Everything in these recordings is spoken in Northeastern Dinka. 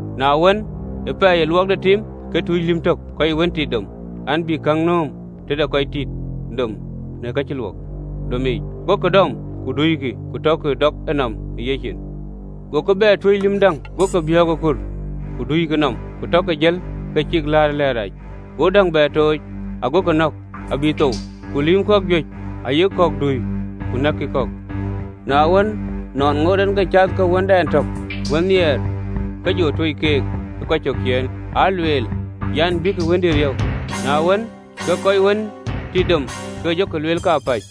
Na wën, ë pɛɛi ë luɔk de tim, ke tuc lïm tök kɔc wën tit dom an, bï käŋ nööm tëde kɔc tit dom në ka cï luɔk domic. Gokï dɔm, ku duikï, ku tɔkï dɔk enɔm ë yecin. Go ke bɛ tuöc lïm däŋ, gokï biɔ̈ɔ̈k ë kur, ku duikï nɔm, ku tɔkï jël, ke cïk läät ë lɛ̈ɛ̈t rac. Go däŋ bɛ tooc, agokï nɔ̈k abï thou: ku loikï lïïm kɔ̈k juëc aya, ayek kɔ̈k dui, ku nɛ̈kkï kɔ̈k. Na wën, nɔn ŋoot en ke cath ke wëndɛn tök, wën nhiɛɛr, ke jɔ tuöc keek ë kɔc cök ciëën, aa lueel an, ‘Abïk wëndï riëëu.’ Na wën, ke kɔc wën tit dom ke jɔkï lueel kapäc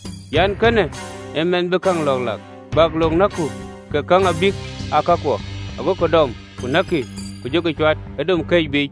an, ‘Kënë ee mɛnh bï käŋ lɔ̈ɔ̈k lak, bäk lok näkku, ke käŋ abïk aa kakuɔ!’ Agokï dɔm, ku näkkï, ku jɔkï cuat ë dom këc biic.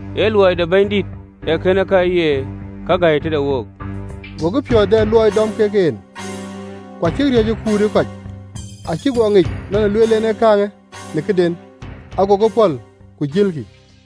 Ee luɔi de Bɛ̈nydït ee kënë, Ka ye këde gäi tëde wook!”’ Gokï piɔ̈ɔ̈th dɛ luɔi dɔm kek en, ku acïk riɔ̈ɔ̈c ë kut ë kɔc: acïk guɔ ŋic nɔn ë lueel en ë kääŋë në këden: agokï pɔ̈l, ku jëlkï.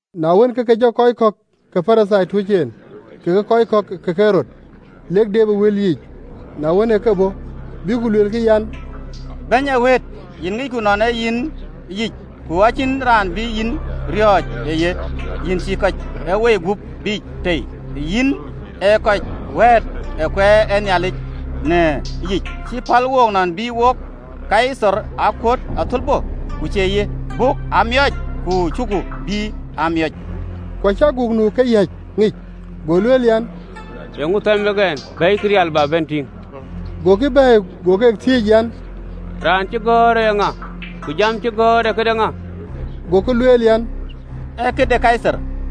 Na wën, ke ke jɔ kɔc kɔ̈k ke Parithai tuöc en, kekë kɔc ke Ɣerod, lek deep ë wël yiic. Na wën, ë ke bɔ̈, bïk ku luelkï an, “Bɛ̈ny ë wëët, yïn ŋicku nɔn ee yïn yic lueel, ku acïn raan bï yïn riɔ̈ɔ̈c ë ye, yïn cïï kɔc ë woi gup biic tei, yïn ee kɔc wɛ̈ɛ̈t ë kueer ë Nhialic në yic. Cï päl wook nɔn bï wok Kaithar aa kuöt athölbö, ku cie ye?” Buk aa miööc, ku cuku bï aa miööc? Ku acï aguk nu ë keyäc ŋic, go lueel an, “Eeŋö thɛm wek ɛn? Bɛ̈ɛ̈ikï rial, bä bɛ̈n tïŋ.” Gokï bɛ̈ɛ̈i. Go keek thiëëc an, “Raan cï gɔ̈ɔ̈rë eeŋa, ku jam cï gɔ̈ɔ̈r ee këde ŋa?” Gokï lueel an, “Ee këde Kaithar.”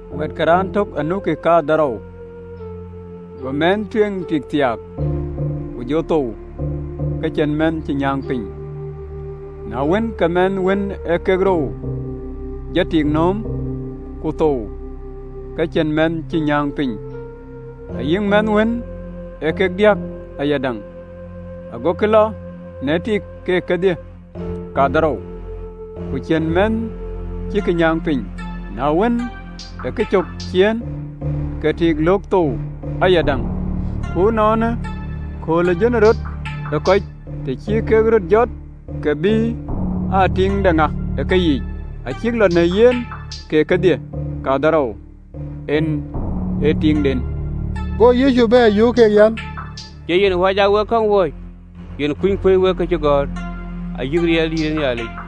Wɛ̈ɛ̈t ke raan tök anukï kadhorou: go mɛnh tueŋ tik thiaak, ku jɔ thou ke cïn mɛnh cï nyääŋ piny. Na wën, ke mɛnh wën ee kek rou jɔ tik nööm, ku thou, ke cïn mɛnh cï nyääŋ piny, ayï mɛnh wën ee kek diäk ayadäŋ: agokï lɔ në tik keek kedhie kadhorou, ku cïn mïth cïk nyääŋ piny. Na wën, ë kecök ciëën, ke tik löök thou ayadäŋ. Ku ënɔɔnë, kööl ë jönërɔt ë kɔc, të cï kek röt jɔt, bï tik jɔ aa tiiŋ de ŋa ë keyiic? Acïk lɔ në yen keek kedhie kadhorou ke ye tiiŋden.” Go Yecu bɛ̈ɛ̈r, yöök keek an, “Cie yen wäc aa wek käŋ wööc, yen kuny kuöc wek kacïgɔ̈ɔ̈r, ayï riɛldïït de Nhialic?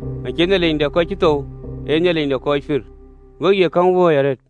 Acie Nhialic de kɔc cï thou, ee Nhialic de kɔc pïïr: we ye käŋ wööc arëët!”